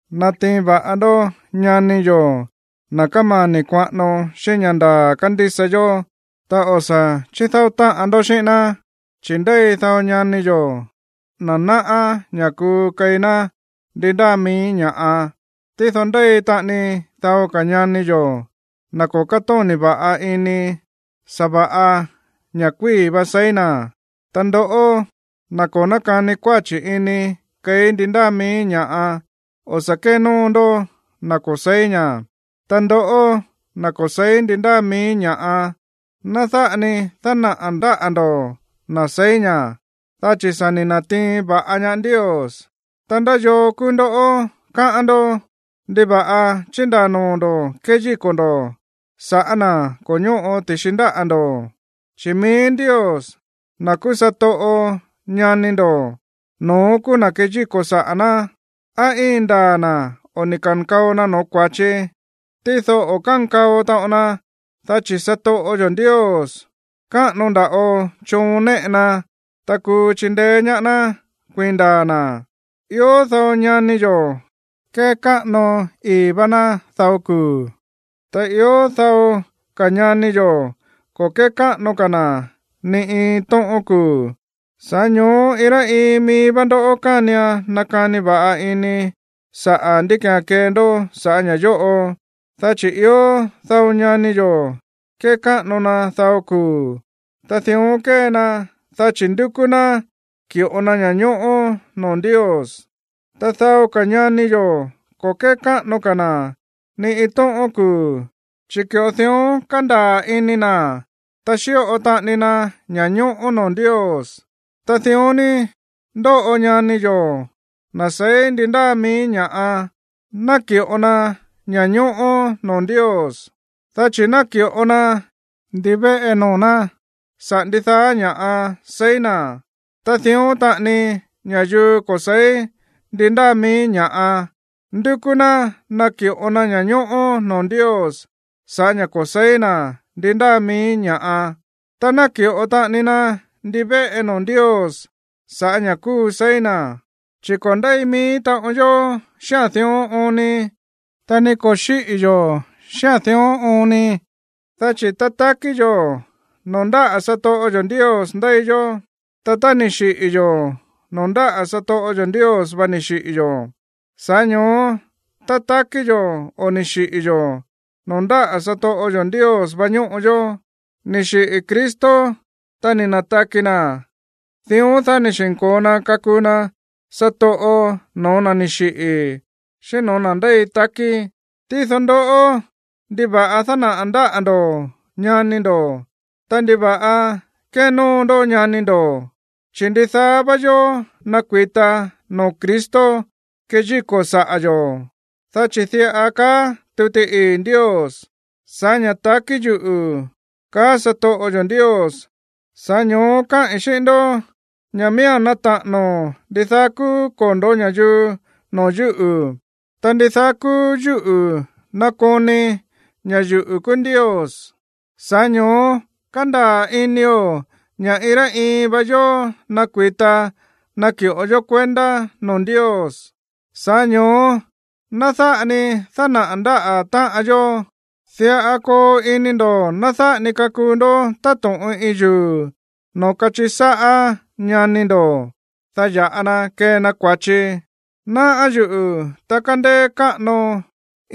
Natiin va̱ꞌa ndó ñani yo̱, na̱ kómani̱ kuaꞌano xíꞌín ña̱ ndaa̱ kándísa yó, ta o̱ sa̱ chídáó táꞌan ndó xíꞌín ná. Chi̱ ndéi dao ñani yo̱, na̱ náꞌá ña̱ kuu keí ná ndi ndáa mií ña̱ꞌa. Tído ndéi taꞌani dao ka̱ ñani yo̱, na̱ ko̱ kátóni̱ va̱ꞌa ini, sa̱va̱ꞌa ña̱ꞌa kuíi̱ va seí na̱. Ta ndoꞌó, na̱ ko̱ nákani kuáchi̱ ini keí ndi ndáa mií ña̱ꞌa, o̱ sa̱ kénóo ndó na̱ ko̱ se̱í ña̱. Ta ndoꞌó, na̱ ko̱ se̱í ndi ndáa mií ña̱ꞌa, ná dáꞌa ni dánaꞌa̱ ndáꞌa̱ ndo̱ na̱ seí ña̱, dá chi̱ sa̱ ni̱ na̱tiin va̱ꞌa ñaá Ndios. Ta, ¿ndá yoo kúú ndó, káꞌán ndó? ¿Ndiva̱ꞌa chíndaa̱ noo̱ ndo̱ kéyíko̱ ndo̱ sa̱ꞌá na̱ ko̱ ñóꞌo ti̱xi ndáꞌa̱ ndo̱? Chi̱ mií Ndios, na̱ kúú satoꞌo ñani ndo̱, no̱ón kúú na̱ kéyíko̱ saꞌa̱ ná, á íin ndaa̱ na̱ o ni̱ ka̱nkao na no̱ó kua̱chi. Tído o̱ kánkao taꞌon na, dá chi̱ satoꞌo yo̱ Ndios, káꞌano nda̱ꞌo choon néꞌe na, ta kuu chindeé ñaá ná kuiin ndaa̱ na̱. Ió dao ñani yo̱ kékáꞌano ii̱ vá ná dao kuu̱, ta ió dao ka̱ ñani yo̱ ko̱ kékáꞌano ka̱ na̱ ni iin tóꞌón kuu̱. Sa̱ꞌá ño̱ó iin rá iin mií vá ndó kánian nakani va̱ꞌa ini sa̱ꞌá ndí ki̱án kee ndó saꞌa̱ ña̱ yóꞌo. Dá chi̱ ió dao ñani yo̱ kékáꞌano na dao kuu̱, ta dión kée na dá chi̱ ndúkú ná ki̱ꞌo na ña̱ñóꞌó noo̱ Ndios. Ta dao ka̱ ñani yo̱ ko̱ kékáꞌano ka̱ na̱ ni iin tóꞌón kuu̱, chi̱ ki̱ꞌo dión kándaa̱ ini na̱, ta xíꞌo taꞌani na ña̱ñóꞌó noo̱ Ndios. Ta dión ni ndóꞌo ñani yo̱, na̱ seí ndi ndáa mií ña̱ꞌa, náki̱ꞌo na ña̱ñóꞌó noo̱ Ndios, dá chi̱ náki̱ꞌo na ndivéꞌe noo̱ ná saꞌa̱ ndidaá ña̱ seí na̱. Ta dión taꞌani ña̱yuu ko̱ se̱í ndi ndáa mií ña̱ꞌa, ndúkú ná naki̱ꞌo na ña̱ñóꞌó noo̱ Ndios sa̱ꞌá ña̱ ko̱ se̱í na̱ ndi ndáa mií ña̱ꞌa, ta náki̱ꞌo taꞌani na ndivéꞌe noo̱ Ndios sa̱ꞌá ña̱ kúu seí na̱. Chi̱ ko̱ ndéi mií taꞌon yó xíꞌa̱n dión oon ni, ta ni ko̱ xíꞌi̱ yo̱ xíꞌa̱n dión oon ni. Dá chi̱ tá takí yo̱, noo̱ ndáꞌa̱ satoꞌo yo̱ Ndios ndéi yó. Ta tá ni̱ xiꞌi̱ yo̱, noo̱ ndáꞌa̱ satoꞌo yo̱ Ndios vá ni̱ xiꞌi̱ yo̱. Sa̱ꞌá ño̱ó, tá takí yo̱ o ni̱ xiꞌi̱ yo̱, noo̱ ndáꞌa̱ satoꞌo yo̱ Ndios vá ñóꞌo yó. Ni̱ xiꞌi̱ Cristo, ta ni̱ na̱taki na̱, dión, dá ni̱ xi̱nko̱o na kakuu na satoꞌo no̱ó na̱ ni̱ xiꞌi̱ xíꞌín no̱ó na̱ ndéi takí. Tído ndoꞌó, ¿ndiva̱ꞌa dánaꞌa̱ ndáꞌa̱ ndo̱ ñani ndo̱? Ta, ¿ndiva̱ꞌa kénóo ndó ñani ndo̱? Chi̱ ndidaá vá yó nakui̱ta noo̱ Cristo keyíko̱ saꞌa̱ yo̱. Dá chi̱ diꞌa kaá tuti ii̱ Ndios: Sa̱ꞌá ña̱ takí yuꞌu̱, kaá satoꞌo yo̱ Ndios, sa̱ꞌá ño̱ó káꞌi̱n xíꞌín ndó ña̱ miía̱n nata̱ꞌa̱no̱ ndidaá kúú kondo̱ ña̱yuu noo̱ yúꞌu̱, ta ndidaá kúú yúꞌu̱ nakoni ña̱ yuꞌu̱ kúú Ndios. Sa̱ꞌá ño̱ó kándaa̱ inio̱ ña̱ iin rá iin vá yó nakui̱ta naki̱ꞌo yó kuendá noo̱ Ndios. Sa̱ꞌá ño̱ó ná dáꞌa ni dánaꞌa̱ ndáꞌa̱ táꞌan yó. Diꞌa koo ini ndo̱ ná dáꞌa ni kakuu ndó táto̱ꞌon iin yuu̱ noo̱ kachiꞌi sáꞌá ñani ndo̱, dá ya̱ꞌa na kee na kua̱chi. Náꞌá yuꞌu̱, ta kándéé káꞌano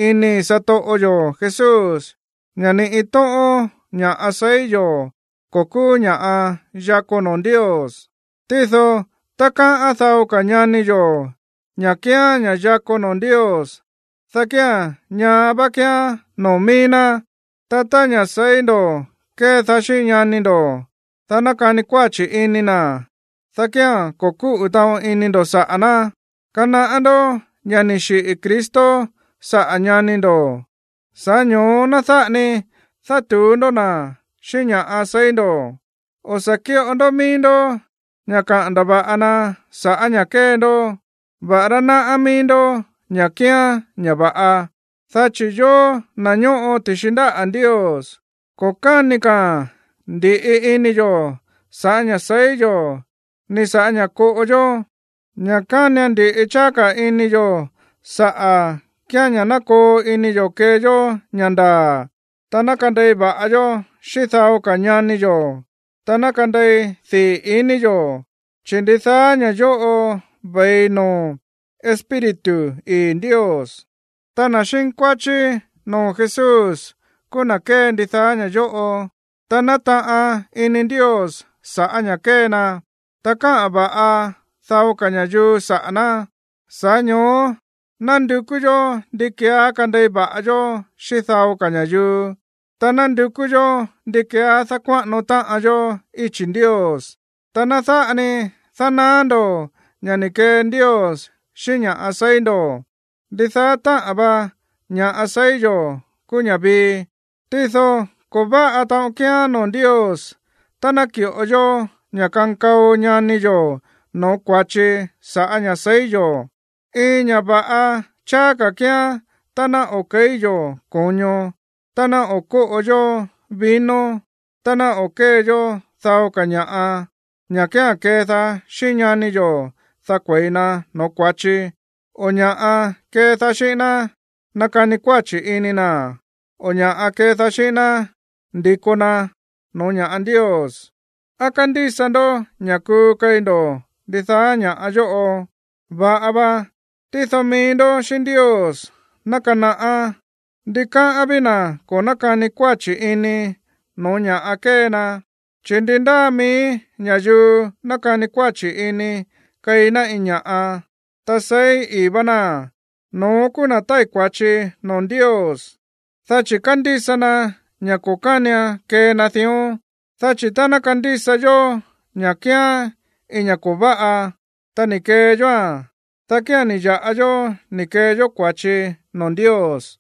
inii̱ satoꞌo yo̱ Jesús ña̱ ni iin tóꞌón ña̱ꞌa seí yo̱ ko̱ kúú ña̱ꞌa yakó noo̱ Ndios. Tído tá káꞌán dao ka̱ ñani yo̱ ña̱ kíán ña̱ꞌa yakó noo̱ Ndios, dá kía̱n ñaá vá kíán noo̱ mií ná. Ta tá ña̱ seí ndo̱ kédaá xíꞌín ñani ndo̱, dá nakani kuáchi̱ ini na̱, dá kía̱n ko̱ kúꞌu̱ taꞌon ini ndo̱ saꞌa̱ ná. Kanaꞌá ndó ña̱ ni̱ xiꞌi̱ Cristo saꞌa̱ ñani ndo̱, sa̱ꞌá ño̱ó ná dáꞌa ni dátu̱ú ndó na̱ xíꞌín ña̱ seí ndo̱. O̱ sa̱ kíꞌo ndó mií ndó ña̱ kaꞌa̱n ndava̱ꞌa na sa̱ꞌá ña̱ kée ndó, va̱ꞌará náꞌá mií ndó ña̱ kíán ña̱ va̱ꞌa. Dá chi̱ yóó, na̱ ñóꞌo ti̱xi ndáꞌa̱ Ndios, ko̱ káni ka̱a̱n ndi̱ꞌi ini yo̱ sa̱ꞌá ña̱ seí yo̱ ni sa̱ꞌá ña̱ koꞌo yó. Ña̱ kánian ndi̱ꞌi cháá ka̱ ini yo̱ saꞌa̱ kíán ña̱ ná koo ini yo̱ kee yó ña̱ ndaa̱, ta ná kandei va̱ꞌa yó xíꞌín dao ka̱ ñani yo̱, ta ná kandei dii̱ iní yo̱, chi̱ ndidaá ña̱ yóꞌo ve̱i noo̱ Espíritu ii̱ Ndios. Ta na̱ xínkuáchí noo̱ Jesús kúú na̱ kée ndidaá ña̱ yóꞌo, ta nátaꞌan ini Ndios sa̱ꞌá ña̱ kée na, ta káꞌa̱n va̱ꞌa dao ka̱ ña̱yuu saꞌa̱ ná. Sa̱ꞌá ño̱ó ná ndukú yó ndi keeá kandei va̱ꞌa yó xíꞌín dao ka̱ ña̱yuu, ta ná ndukú yó ndi keeá dákuáꞌano táꞌan yó íchi̱ Ndios. Ta ná dáꞌa ni danaá ndo̱ ña̱ ni̱ kee Ndios xíꞌín ña̱ꞌa seí ndo̱. Ndidaá táꞌa̱n va ña̱ꞌa seí yo̱ kúú ña̱ vii. Tído ko̱ váꞌa taꞌon kíán noo̱ Ndios tá ná ki̱ꞌo yó ña̱ kankao ñani yo̱ no̱ó kua̱chi sa̱ꞌá ña̱ seí yo̱. Iin ña̱ va̱ꞌa cháá ka̱ kíán tá ná o̱ ke̱í yo̱ ko̱ño, ta ná o̱ kóꞌo yó vino, ta ná o̱ kée yó dao ka̱ ña̱ꞌa, ña̱ kía̱n kédaá xíꞌín ñani yo̱, dá kue̱i na no̱ó kua̱chi, o ña̱ꞌa kédaá xíꞌín ná nakani kuáchi̱ ini na̱, o ña̱ꞌa kédaá xíꞌín ná ndi̱ko na no̱ó ña̱ꞌa Ndios. ¿Á kándísa ndó ña̱ kuu keí ndo̱ ndidaá ña̱ yóꞌo? Va̱ꞌa va, tído mií ndó xíꞌín Ndios ná kanaꞌá. Ndikáꞌán ví na̱ ko̱ nákani kuáchi̱ ini no̱ó ña̱ kée na. Chi̱ ndi ndáa mií ña̱yuu nákani kuáchi̱ ini keí ná iin ña̱ꞌa, ta seí ii̱ vá náa̱n, no̱ón kúú na̱ tái̱ kua̱chi noo̱ Ndios, dá chi̱ kándísa na ña̱ ko̱ kánian kee na dión. Dá chi̱ tá ná kandísa yó ña̱ kíán iin ña̱ ko̱ váꞌa, ta ni̱ kee yóa̱n, dá kía̱n ni̱ ya̱ꞌa yó ni̱ kee yó kua̱chi noo̱ Ndios.